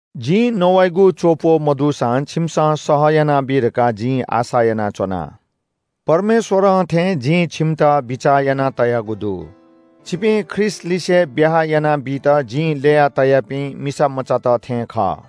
जिं नवाइगु च्‍वःप्‍वः मदुसां छिमिसं सह यानाबी धकाः जिं आशा यानाच्‍वना। परमेश्‍वरं थें जिं छिमित बिचाः यानातयागु दु। छिपिं ख्रीष्‍टलिसे ब्‍याहा यानाबीत जिं ल्‍ययातयापिं मिसामचात थें खः।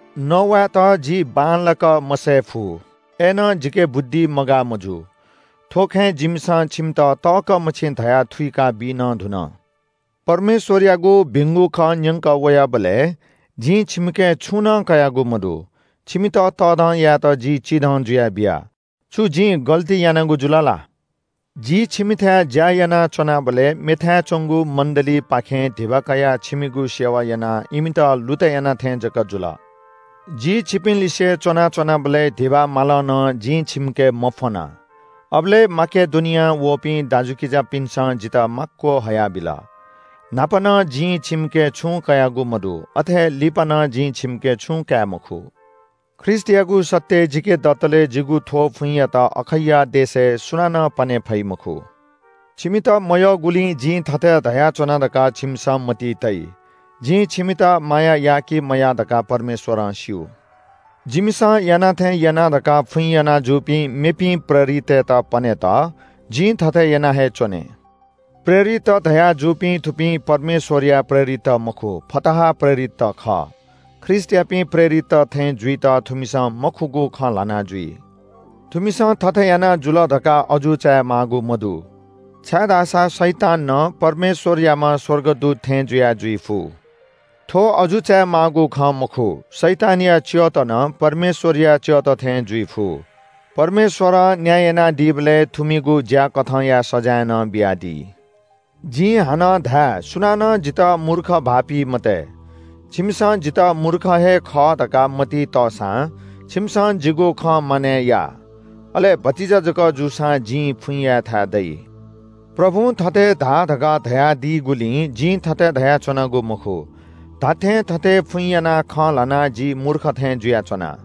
नवायेत जि बांलाक मसये फु, अय्‌नं जिके बुद्धि मगाः मजू। थ्‍व खँय् जिमिसं छिमित तःकः मछि धयाः थुइकाबी नं धुन। परमेश्‍वरयागु भिंगु खँ न्‍यंकः वयाबलय् जिं छिमिके छुं नं कयागु मदु। छिमित तःधं यायेत जि चिधं जुया बिया। छु जिं द्वंकागु जुल ला? जि छिमिथाय् ज्‍या यानाच्‍वनाबलय् मेथाय् च्‍वंगु मण्‍डलीपाखें धिबा कयाः छिमिगु सेवा यानाः इमित लुतय् याना थें जक जुल। जि छिपिंलिसे च्‍वना च्‍वनाबलय् धिबा मालं नं जिं छिमिके मफ्‍वना। अबलय् माकेडोनियां वःपिं दाजुकिजापिन्‍सं जितः माक्‍व हयाबिल। न्‍हापा नं जिं छिमिके छुं कयागु मदु, अथे हे लिपा नं जिं छिमिके छुं काये मखु। ख्रीष्‍टयागु सत्‍य जिके दतले जिगु थ्‍व फुइँयात अखैया देशय् सुनानं पने फइ मखु। छिमित मयःगुलिं जिं थथे धयाच्‍वना धकाः छिमिसं मतिइ तइ। जिं छिमित माया या कि मया धकाः परमेश्‍वरं स्‍यू। जिमिसं याना थें याना धकाः फुइँ याना जूपिं मेपिं प्रेरितय्‌त पनेत जिं थथे याना हे च्‍वने। प्रेरितत धयाजूपिं थुपिं परमेश्‍वरया प्रेरितत मखु, फताहा प्रेरितत खः। ख्रीष्‍टयापिं प्रेरितत थें जुइत थुमिसं मखुगु खँ ल्‍हाना जुइ। थुमिसं थथे याना जुल धकाः अजू चायेमाःगु मदु, छाय्‌धाःसा शैतान नं परमेश्‍वरयाम्‍ह स्‍वर्गदूत थें जुया जुइफु। थ्‍व अजू चायेमाःगु खँ मखु, शैतानया च्‍यःत नं परमेश्‍वरया च्‍यःत थें जुइफु। परमेश्‍वरं न्‍याय यानादीबलय् थुमिगु ज्‍याकथंया सजाँय नं बियादी। जिं हानं धाये – सुनानं जितः मूर्ख भाःपी मते। छिमिसं जितः मूर्ख हे खः धकाः मतिइ तःसां छिमिसं जिगु खँ मानय् या, अले भतिचा जक जूसां जिं फुइँ यायेथाय् दइ। प्रभुं थथे धा धकाः धयादीगुलिं जिं थथे धयाच्‍वनागु मखु। धात्‍थें थथे फुइँ यानाः खँ ल्‍हानाः जि मूर्ख थे जुयाच्‍वना।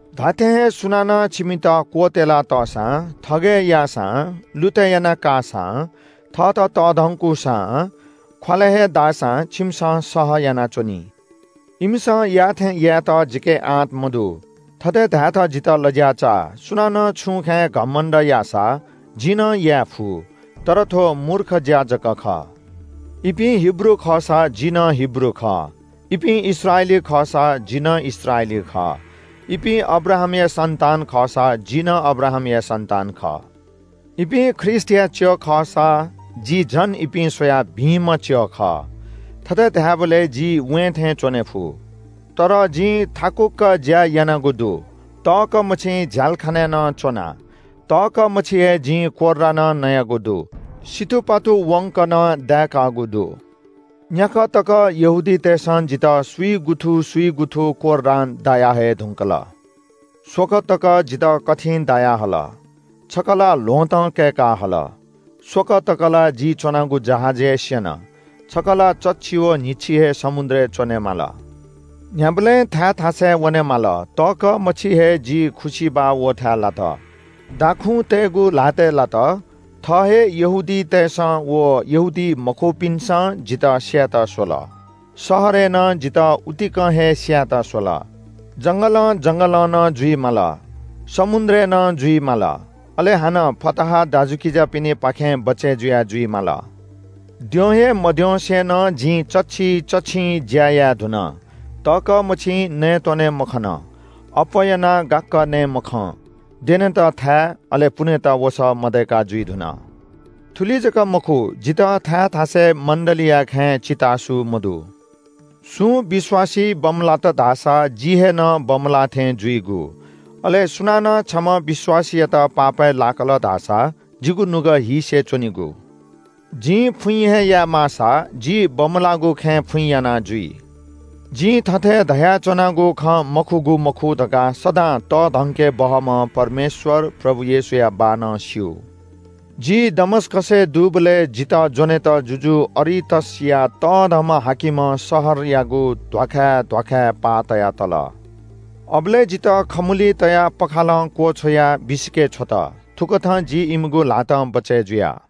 धात्‍थें हे सुनानं छिमित क्‍वत्‍यला तःसां, थगय् याःसां, लुतय् यानाकाःसां, थःत तःधंकूसां, ख्‍वालय् हे दाःसां छिमिसं सह यानाच्‍वनी। इमिसं याःथें यायेत जिके आँट मदु, थथे धायेत जितः लज्‍या चाः। सुनानं छुं खँय् घमण्‍ड याःसा जिं नं याये फु। तर थ्‍व मूर्ख ज्‍या जक खः। इपिं हिब्रू खःसा, जि नं हिब्रू खः। इपिं इस्राएली खःसा, जि नं इस्राएली खः। इपिं अब्राहामया सन्‍तान खःसा, जि नं अब्राहामया सन्‍तान खः। इपिं ख्रीष्‍टया च्‍यः खःसा जि झन इपिं स्‍वयाः भिंम्‍ह च्‍यः खः। थथे धायेबलय् जि वें थें च्‍वने फु। तर जिं थाकुक्‍क ज्‍या यानागु दु, तःकः मछि झ्‍यालखानाय् नं च्‍वना। तःकः मछि हे जितः कोर्रां दाःगु दु, तःकः मछि जितः सितुपातु वंक दाःगु दु। न्‍याकः तक यहूदीतय्‌सं जितः स्‍विगुथु स्‍विगुथु कोर्रां दायाहये धुंकल। स्‍वकः तक जितः कथिं दायाहल, छकः ला ल्‍वहँतं कय्‌काहल। स्‍वकः तक ला जि च्‍वनागु जहाज हे स्‍यन, छकः ला चच्‍छि व न्‍हिच्‍छि हे समुद्रय् च्‍वनेमाल। न्‍ह्याबलें थाय् थासय् वनेमाल, तःकः मछि हे जि खुसिबाः वःथाय् लात, दाखुँतय्‌गु ल्‍हातय् लात, थः हे यहूदीतय्‌सं व यहूदीमखुपिन्‍सं जितः स्‍यायेत स्‍वल। शहरय् नं जितः उतिकं हे स्‍यायेत स्‍वल, जंगलं जंगलं नं जुइ माल। समुद्रय् नं जुइ माल। अले हानं फताहा दाजुकिजापिनिपाखें बचय् जुया जुइ माल। द्यँ हे मद्यंसे नं जिं चच्‍छि चच्‍छिं ज्‍या याये धुन। तःकः मछि नयेत्‍वने मखन। अप्‍वः यानाः गाक्‍क नये मखं, द्यनेत थाय्, अले पुनेत वसः मदय्‌का जुइ धुन। थुलि जक मखु, जितः थाय् थासय् मण्‍डलीया खँय् चितासू मदु। सुं विश्‍वासी बमलात धाःसा जि हे नं बमलाः थें जुइगु। अले सुनानं छम्‍ह विश्‍वासीयात पापय् लाकल धाःसा जिगु नुगः हीसे च्‍वनीगु। जिं फुइँ हे याये माःसा, जि बमलाःगु खँय् फुइँ याना जुइ। जिं थथे धयाच्‍वनागु खँ मखुगु मखु धकाः सदां तःधंके बहःम्‍ह परमेश्‍वर प्रभु येशूया बाः नं स्‍यू। जि दमस्‍कसय् दुबलय् जितः ज्‍वनेत जुजु अरितसया तःधंम्‍ह हाकिमं शहरयागु ध्‍वाखाय् ध्‍वाखाय् पाः तया तल। अबलय् जितः खमुलिइ तयाः पःखालं क्‍वछ्वयाः बिसिके छ्वत। थुकथं जि इमिगु ल्‍हातं बचय् जुया।